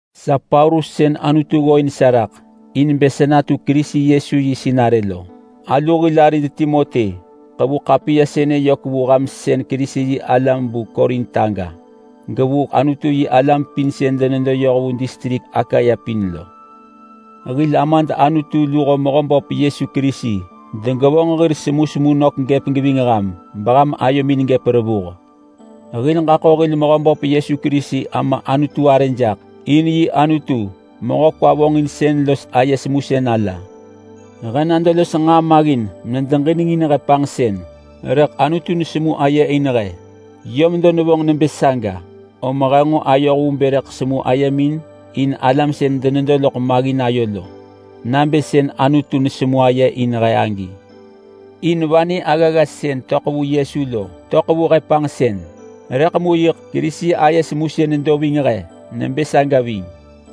Sa Paulus sën Anutu ggooin sa raḳ in bë sa natu Kerisi Yesu yi sinarë lo. Alu hil arid Timoti ḳevu ḳapiya sënë yök vu ham sën Kerisi-yi-alam vu Korint aga, gevu Anutu-yi-alam pin sën denedo yoh vu distrik Akaya pin lo. Hil Amad Anutu luho Mehöböp Yesu Kerisi degevonġ hir semusemu nök gëp geving ham beham ayomin gëp revuh. Hil ġaḳo hil Mehöböp Yesu Kerisi Ama Anutu arë jaḳ, in yi Anutu, mehö kwa vonġinsën los aye semusën ala. He nado los nġaa maggin medeġinengin he panġsën rëḳ Anutu nesemu aye in he. Yö medo nevonġ nebë saga, om he nġo ayoh vu bë rëḳ semu ayemin in alam sën denedo loḳ maggin ayo lo, nabë sën Anutu nesemu aye in he agi. In vanë aggagga sën töḳ vu Yesu lo töḳ vu he panġsën, rëḳ mu yiḳ Kerisi aye semusën nedo ving he nebë saga ving.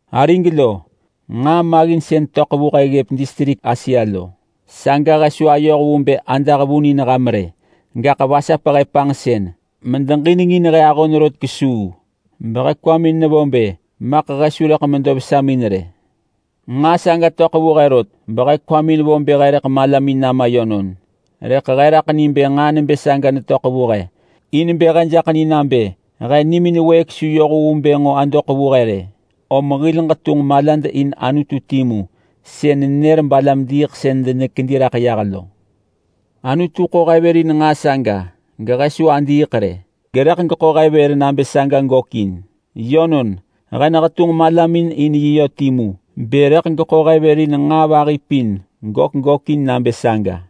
Arig lo, nġaa maggin sën töḳ vu he ggëp distrik Asia lo, saga he su ayoh vu bë adah vun in ham rë. Gaḳ vasap he panġsën medeġinengin he ahon rot kesuu behe kwamin nevo bë maḳ he su rëḳ medo vesamin rë. Nġaa saga töḳ vu he rot behe kwamin vo bë he rëḳ malamin nama yönon. Rëḳ he raḳ ni bë nġaa nebë saga netöḳ vu he in bë he jaḳ ni nabë he nimin wëëk su yoh vu bë adoḳ vu he rë, om hil ġetunġ malad in Anutu timu sën nenër balam-diiḳsën denekedi raḳ yah lo. Anutu ḳo he vër in nġaa saga gehe su adiiḳ rë, gerëḳ geḳo he vër nabë saga gökin. Yönon, he nehetunġ malamin in yi yö timu bë rëḳ geḳo he vër in nġaa vahi pin gök gökin nabë saga.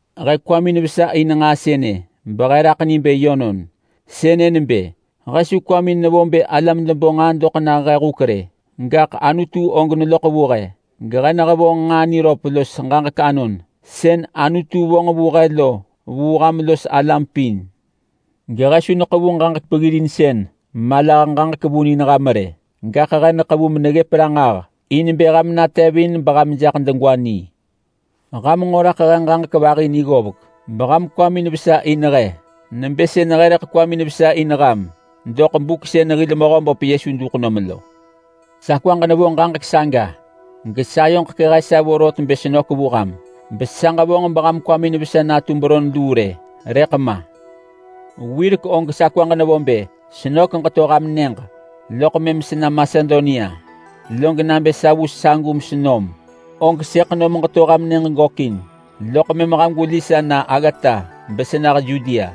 He kwamin vesa in nġaa sënë behe raḳ ni bë yönon. Sënë nebë: He su kwamin nevo bë alam debo nġaa doḳ nah he huk rë, gaḳ Anutu og neloḳ vu he, gehe nehevonġ nġaa niröp los ġaġek anon sën Anutu vonġ vu he lo vu ham los alam pin. Gehe su neḳevu ġaġek peggirinsën malah ġaġek vun in ham rë, gaḳ he neḳevu meneggëp ranġah in bë ham natevin beham jaḳ degwa ni. Ham nġo raḳ he ġaġek vahi ni ggovek beham kwamin vesa in he nebë sën he rëḳ kwamin vesa in ham doḳ buk sën hil Mehöböp Yesu duḳ nom lo. Sa kwaġ nevo ġaġek saga gesayoġ kehe sa vorot bë senök vu ham, besa ġevonġ beham kwamin vesa natu beron luu rë, rëḳ ma. Wirek og sa kwaġ nevo bë senök geto ham nyëġ loḳ mëm sena Masedonia. Log nabë sa vu sagu mesenom, og sëḳ nom ġeto ham nyëġ gökin, loḳ mëm ham gweli sa na aggata besenah Yudea.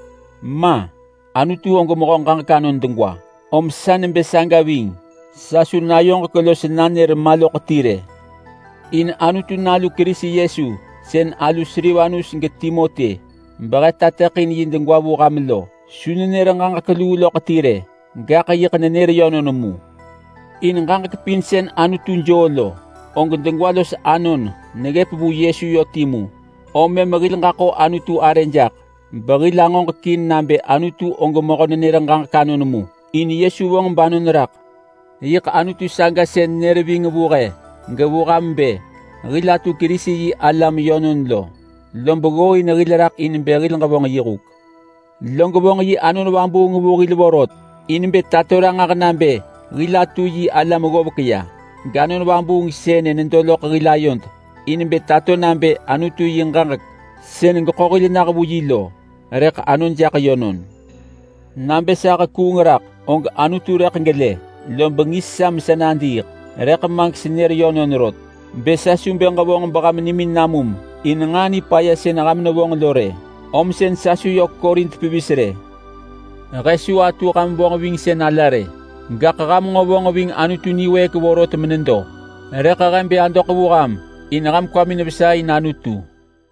Ma! Anutu mehö ġaġek anon degwa, om sa nebë saga ving. Sa su nayoġek los nanër ma loḳ ti rë. In Anutu Nalu Kerisi Yesu sën alu Silvanus geTimoti behe netateḳin yi degwa vu ham lo su nenër ġaġek luu loḳ ti rë, gaḳ yiḳ nenër yönon mu. In ġaġek pin sën Anutu joo lo, og degwa los anon neggëp vu Yesu yö timu, om mëm hil ġaḳo Anutu arë jaḳ behil angoġekin nabë Anutu og mehö nenër ġaġek anon mu. In Yesu vonġ banon raḳ. Yiḳ Anutu saga sën nër ving vu he gevu ham bë hil atu Kerisi-yi-alam yönon lo, lob ggooin hil raḳ in bë hil ġevonġ yi huk. Log vonġ yi Anon Vabuung vu hil vorot in bë tato ranġah nabë hil atu yi alam ggovek ya, gAnon Vabuung sënë nedo loḳ hil ayod in bë tato nabë Anutu yi ġaġek sën geḳo hil nah vu yi lo rëḳ anon jaḳ yönon. Nabë sa hekuung raḳ, og Anutu rëḳ gelë lob ngis sa mesa nadiiḳ. Rëḳ ma gesenër yönon rot bë sa su bë ġevonġ beham nimin namum in nġaa nipaya sën ham nevonġ lo rë, om sën sa su yök Korint pevis rë. He su atu ham vonġvingsën ala rë, gaḳ ham nġo vonġ ving Anutu niwëëk vorot menedo, rëḳ he bë adoḳ vu ham in ham kwamin vesa in Anutu.